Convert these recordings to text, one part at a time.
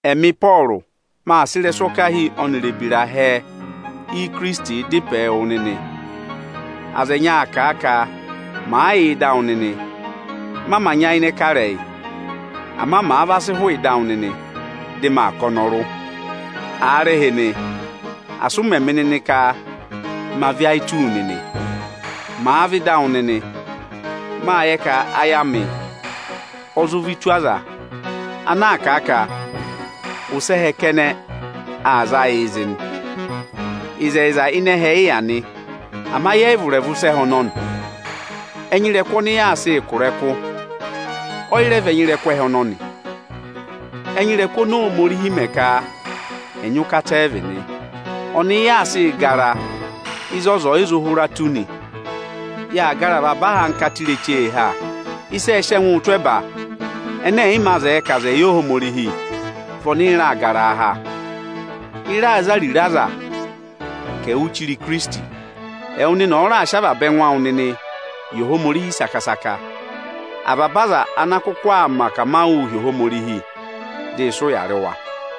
Ẹmị Ịpọọrụ, mâ sị ịrẹswọkahi ọnịrị ebira hẹẹ Ikirisiti dá ịpẹ wụ nịnị. Aza ẹnyị aa kà a ka màa yà ịdị awụ nịnị, ma mā nyayịnẹ kà ịrẹyị; ama màa va sị hụụ ịdị awụ nịnị, dị maa kà ọnọrụ. Aarịhịnị, asị ụ mẹ̀ mị nịnị ka ma vị́ ayị tụ́ wu nịnị, màa vẹ ịdị awụ nịnị! Mâ yẹ ka ayị amị ọ zụ vị́ tù aza ana aa kà a ka ụsẹ ẹhẹ kẹnẹ aa za yịị zị nị. Ịzẹyịza ịnị ẹhẹ ị yà nị, ama yẹ yị vụ̀ ịrẹvụ ịsa ẹhẹ ọnọnị. Ẹnya ịrẹkụ ọnị yaa sịị kụ̀ ịrẹkụ, ọyị rẹ vị ẹnya ịrẹkụ ẹhẹ ọnọnị. Ẹnya ịrẹkụ oni Ohomorihi mẹ ka ẹ̀ nyị ụkata ẹ vị nị. Ọnị ị yaa sịị gara ịzị ọza ọ̀ yị zụ hụra tù nị. Yaa gara avaba ahankata ireche ha. Ịsị ẹẹ̄ sị ẹngụụ tụ́ ẹba ẹnẹ ẹ̀yị mā zẹẹ ka aza ẹ̀ yẹ Ohomorihi vị ọnị ị raa garaa ha. Ị raa za ariro aza ka ẹ̀ẹ wụ́ụ chire Ikirisiti. Ẹwụ nịnị ọ̀ọ raà sị avaba ẹngụ awụ nịnị yị Ohomorihi saka-saka, avaba aza ana àa kụkụ aa mẹ akamawụụ hi Ohomorihi, dị ị sị ụya rị wa.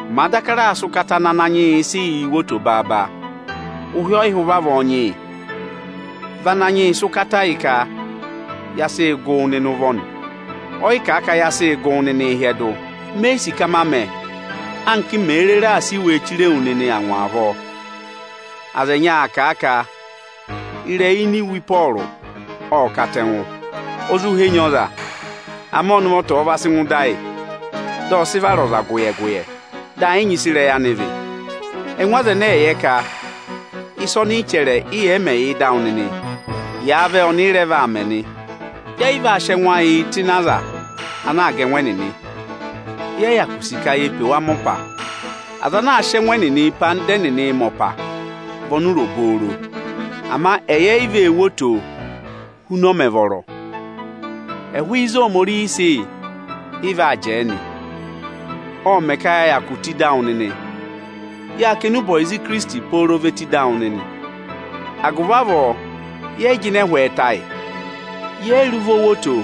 Màa daka raà sị ụkata ana Ananyị yị sị yị wo oto baaba, ụhị ọ yị hụ ụvị avọọ nyị yị. Vị Ananyị yị sị ụkata yị ka ya sị gụ wụ nịnị ụvọ nị, ọ yị kà a ka ya sị gụ wụ nịnị hyẹdụ. Me yi sì ka ma mẹ, anka m mèe rere aa sị iwe chire wu nịnị angwa avọọ. Aza ẹnyị aa kà a ka ịrẹyị ini iwe Ịpọọrụ ộ katẹngụ, o zụ henyi ọza. Ama ọnị ụvọta ọ̀ọ va sị ngụ ịdị ayị dị ọ sị vara ọza gụyẹ-gụyẹ, dị ẹ yị nyị ịsị ịrẹyị anị vị. Ẹngụ aza ẹnẹẹ ẹ̀ yẹ ka ịsị ọnị chẹrẹ, ị yẹ̀ yị mẹ̀ yà ịdị awụ nịnị, yàa vẹ, ọnị ị rẹ vaa mẹ nị o. Yẹ yị vaa sị ẹngụ ayịị tụ́ ịnị aza anaā ga ẹngụ ẹnịnị, yẹ yị hyakụ sì ka ye pe wa mẹ ọpa. Aza ana aa sị ẹngụ ẹnẹnịị pe anda ẹnịnị mẹ ọpa vị ọnụra obooro! Ama ẹyị e yi vee wo oto huna ọ mẹ̀ vọrọ. Ẹhụ ịzị Ohomorihi ọ̀ọ sị yị, ị vaa jẹẹ nị; ộ mẹ̀ ka ya hyakụ tù ịdị awụ nịnị. Yâ kà enube ọyịza Ikirisiti pooro ve tù ịdị awụ nịnị. Agụvị avọọ yẹẹ̀ yị jịnẹ ẹhwị ẹtẹ ayị. Yẹ yị rị ụvọ wo oto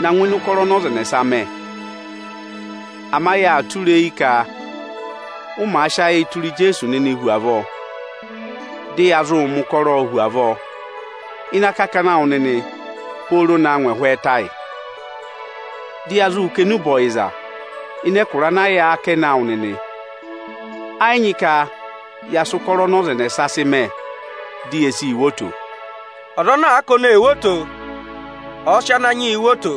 na ngụ ịnị ụkọrọ ọnị ọza ẹnẹsa mẹ. Ama yaa tụra eyi ka ụ màa sị ayịị tụra Ijeesu nịnịị hu avọọ, dị ya zụụ mẹ ụkọrọọ hu avọọ ịnị akakana awụ nịnị pooro na ngụ ẹhwị ẹtẹ ayị. Dị ya zụ kà enube ọyịza ịnị ẹkụra ana yà akẹnẹ awụ nịnị. Ẹ yị nyị ka ya sị ụkọrọ ọnị ọza ẹnẹsa sị mẹ, di ye sii wo oto. Ọza ana àa ka ọnị ee wo oto, ọ̀ọ sị Ananyị yịị wo oto.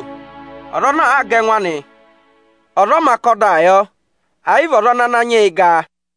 Ọza ana àa ga ẹngụ anị, ọza ọ mā kà ọdaa yọ, ẹ̀ yị vị ọza ọnị Ananyị yị ga.